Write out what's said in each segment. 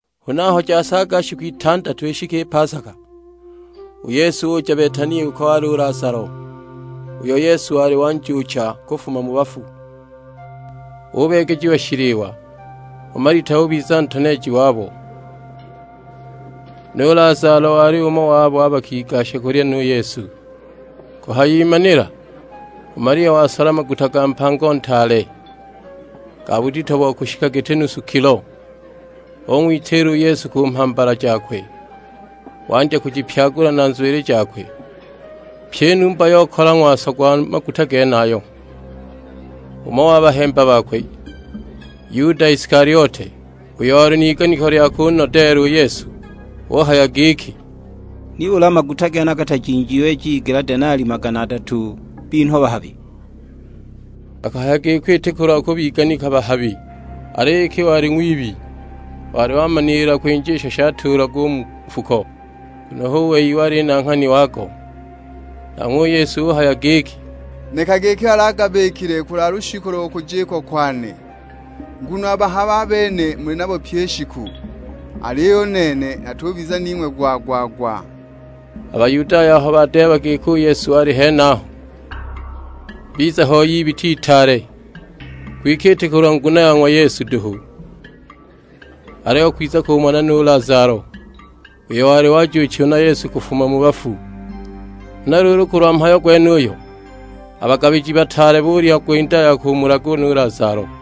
Huna aho jasaaga shiku itandatu ishike i pasaka, u Yesu uja Betania uko wali u Lazalo, uyo Yesu wali wanjuucha kufuma mu bafu. Ubeegejiwa shiliwa, u Malita ubiza ntoneeji wabo; nu Lazalo wali umo wa babo bakigasha kulya nu Yesu. Kuhayimanila u Malia wasola maguta ga mpango ntaale, ga budito bo kushika giti nusu kilo. Ung'witiila u Yesu ku mhambala jakwe, wandya kujipyagula na nzwili jakwe; pyi i numba yokala ng'waso gwa maguta genayo. Umo wa bahemba bakwe, Yuda Isikaliote; uyo wali n'iganiko lya kunodeela u Yesu, uhaya giki, "Nibuli a maguta genaya gatajinjiwe jigela denali magana adatu binhwa bahabi?" Akahaya giko iti kulwa kubiganika bahabi, aliyo iki wali ng'wibi; wali wamaniila kwinja isho shatuulagwa u mu nfuko, nguno hu wei wali nanghani wago. Nanghwe u Yesu uhaya giki, "Nekage iki wali agabikile kulwa lushiku lo kujikwa kwane. Nguno a bahabi a bene muli nabo pyi i shiku, aliyo u nene natubiza ning'we gwa-gwa-gwa." A Bayudaya aho badeeba giki u Yesu wali henaho, biza hoi ibita itaale; kwike iti kulwa nguno ya ng'wa Yesu duhu; aliyo kwiza kumona nu Lazalo, uyo wali wajuuchiwa na Yesu kufuma mu bafu. Huna luulu kulwa mhayo gwenuyo, a bagabiji bataale bulya gwinda ya kumulaga nu Lazalo,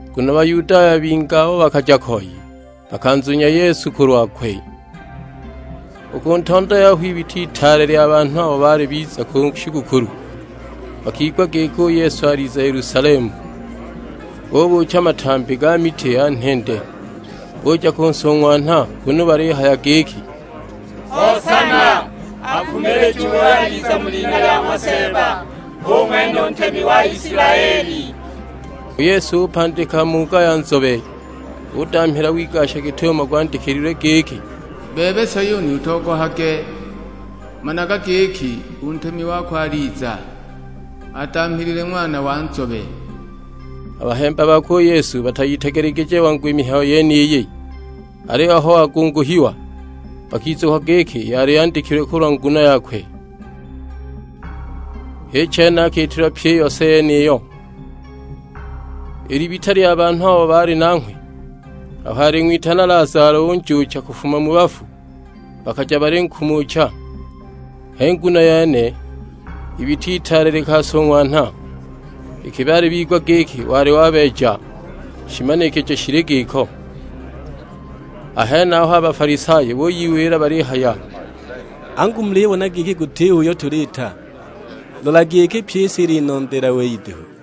nguno Bayudaya bingi abo bakaja koi, bakanzunya Yesu kulwakwe. U ku ntondo yaho ibita itaale lya banhu abo baali biza ku shigukulu, bakigwa giki u Yesu aliza Yelusalemu. Bubuucha matambi ga miti ya nhende, buja kunsung'wanha kunu balihamuka buhaya giki, "Hosana; akumilijiwe uyo aliza mu lina lya ng'wa Seeba, hu ng'wene u Ntemi wa Isilaeli." U Yesu upandika muuga ya nzobe, udamhila wigasha git'umo gwandikilwe giki, "Bebe Sayuni utogohage, Managa giki, u Ntemi wako aliza, adamhilile ng'wana wa nzobe." A bahemba bakwe u Yesu batayitegelegije wangu i mihayo yeniyi; aliyo aho wagunguhiwa, bakizukwa giki yali yandikilwe kulwa nguno yakwe, h'i chene akiitilwa pyi i yose yeniyo. I libita lya banhu abo baali nanghwe aho aling'witana Lazalo unjuucha kufuma mu bafu, bakaja balinkumucha. H'i nguno yene ibita itaale likansung'wanha, iki baali bigwa giki wali wabeeja shimanikijo shili giko. A henaho a Bafalisayo buyiwila balihaya, "Angu mulibona giki gutiho uyo tuliita; lolagi iki pyi i si ilinondeela wei duhu!"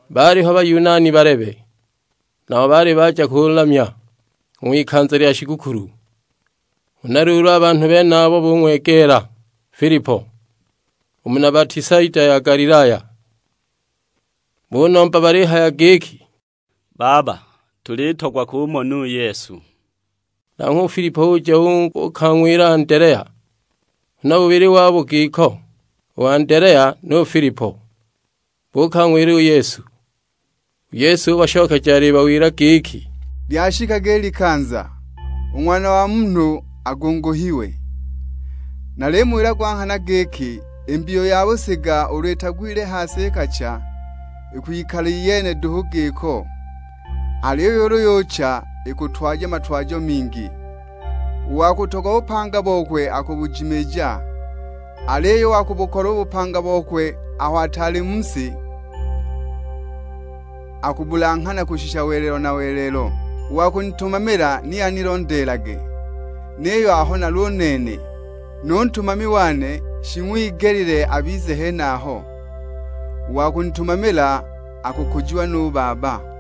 Baaliho Bayunani balebe, nabo baali baja kulamya u ng'wikanza lya shigukulu. Huna luulu a banhu benabo bung'wegeela Filipo, u muna Betisaida ya Galilaya: bunomba balihaya giki, "Baba, tulitogwa kumona u Yesu!" Nanghwe u Filipo uja uukang'wila Andelea; huna bubili wabo giko, u Andelea nu Filipo, buukang'wila u Yesu. U Yesu ubashokeja alibawila giki, "Lyashikaga i likanza, u Ng'wana wa Munhu agunguhiwe. Nalimuwila gwa nghana giki i mbiyu ya busiga ulu itagwile ha si ikacha, ikwikala iyene duhu giko; aliyo ulu yucha ikutwaja matwajo mingi. U wa kutogwa bupanga bokwe akubujimiija; aliyo u wa kubukolwa u bupanga bokwe aho ataali mu si, akubulanghana kushisha welelo na welelo. U wa kunitumamila ni anilondeelage, niyo aho nali u nene, nu ntumami wane shing'wigelile abize henaho; u wa kunitumamila akukujiwa nu Baba!"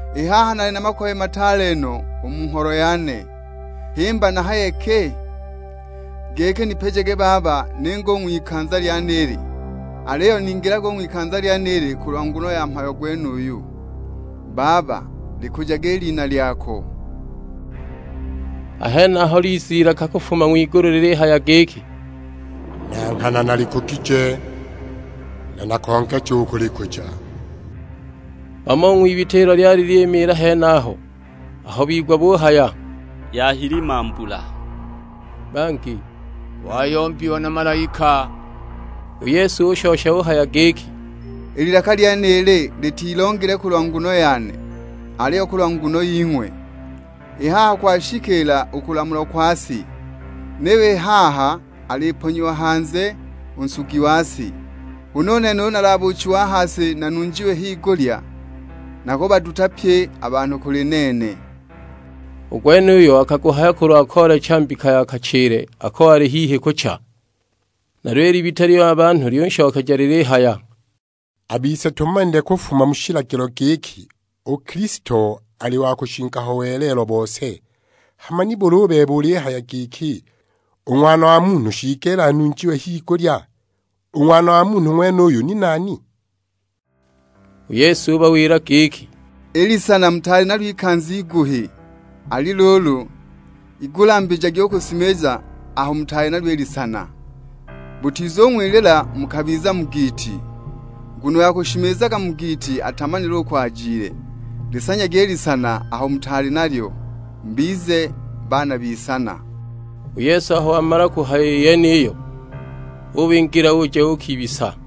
"I haha nali na makoye mataale no u mu ngholo yane, himba nahaye ki? Giki nipijage Baba ninge u ng'wikanza lyenili? Aliyo ningilaga u ng'wikanza lyenili kulwa nguno ya mhayo gwenuyu. Baba, likujage i Lina lyako!" A henaho liza ilaka kufuma ng'wigulu lilihaya giki, "Na nghana nalikugije, na nakongeja u kulikuja!" Bamo u ng'wibita ilo lyali lyimiila henaho aho bigwa buhaya, "Yahilima mbula;" bangi, "Wayombiwa na malaika!" U Yesu ushosha uhaya giki, "I lilaka lyenili litilongile kulwa nguno yane, aliyo kulwa nguno ying'we. I haha kwashikiila u kulamulwa kwa si; niyo i haha aliponyiwa hanze u nsugi wa si. Huna u nene ulu nalabuuchiwe a ha si nanunjiwe higulya, nakubaduta pye a banhu kuli nene." U gwenuyu akaguhaya kulwa koolecha mbika ya kachile ako wali hihi kucha. Nalyo i libita lya banhu lyunshokeja lilihaya, "A bise tumanile kufuma mu shilagilo giki, u Kilisto ali wa kushinga ho welelo bose. Hama nibuli u bebe ulihaya giki, 'U Ng'wana wa Munhu shiigelile anunjiwe higulya?' U Ng'wana wa Munhu ng'wenuyu ni nani?" U Yesu ubawila giki, "I lisana mutaali nalyo ikanza iguhi; ali luulu, igulambijagi u kushimiza aho mutaali nalyo i lisana, butizung'wilila mukabiza mu giiti; nguno uyo akushimizaga mu giiti atamanile uko ajile. Lisanyagi i lisana aho mutaali nalyo, mubize baana b'isana." U Yesu aho wamala u kuhaya i yeniyo ubingila uja uukibisa.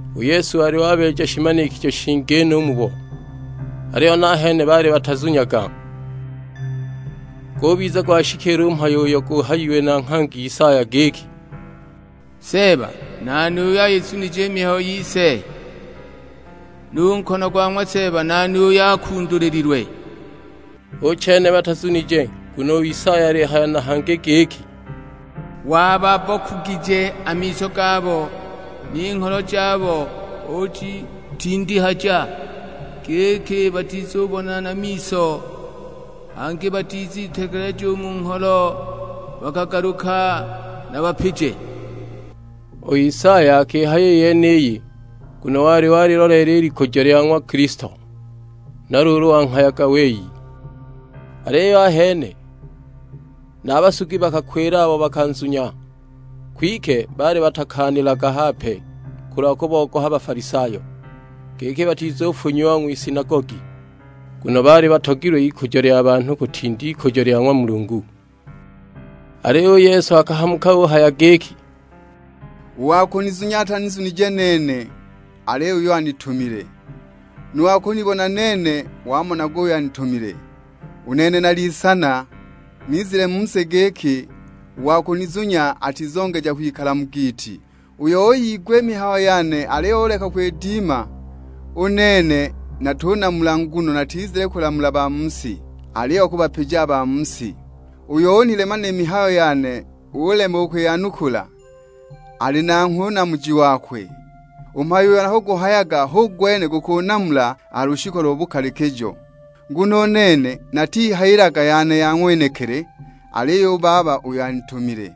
U Yesu wali wabeeja shimanikijo shingi no u mubo, aliyo nahene baali batanzunyaga. Gubiza gwashikiila u mhayo uyo guhayiwe na nghangi Isaya; giki, "Seeba, nani uyo ayizunije i mihayo yise? Nu nkono gwa ng'wa Seeba nani uyo akundulililwe?" Hu chene batazunije, nguno u Isaya alihaya na hangi giki, "Wababbokugije a miso gabo, ni ngholo jabo ujitindihaja, giki batizubona na miso, hangi batizitegeleja u mu ngholo bakagaluka nabapije." U Isaya akihaya i yeniyi nguno wali waliloleela i likujo lya ng'wa Kilisto; huna luulu wanghayaga wei. Aliyo ahene na a basugi bakakwila abo bakanzunya, kwike baali batakaanilaga hape, kulwa kubogoha Bafalisayo, giki batizufunyiwa ng'wisinagogi. Nguno baali batogilwe ikujo lya banhu kutinda ikujo lya ng'wa Mulungu. Aliyo u Yesu akahamuka uhaya giki, "U wa kunizunya atanizunije nene, aliyo uyo anitumile. Nu wa kunibona nene wamonaga uyo anitumile. U nene nali Isana, nizile u mu si giki u wa kunizunya atizongeja kwikala mu giiti. Uyo uyigwa i mihayo yane aliyo uleka u kwidima, u nene natunamula nguno natizile kulamula ba mu si, aliyo kubapija a ba mu si. Uyo unilema ni mihayo yane ulema u kwiyanukula, ali nanghwe u namuji wakwe. U mhayo uyo nakuguhayaga hu gwene gukunamula a ha lushiku lo bukalikijo. Nguno u nene natihayilaga yane ya ng'wenekili, aliyo u Baba uyo anitumile,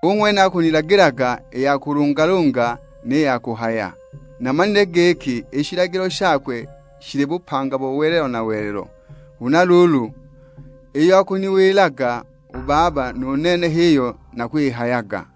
hu ng'wene akunilagilaga i ya kulungalunga ni ya kuhaya. Namanile giki i shilagilo shakwe shili bupanga bo welelo na welelo; huna luulu iyo akuniwilaga u Baba, nu nene h'iyo nakwihayaga."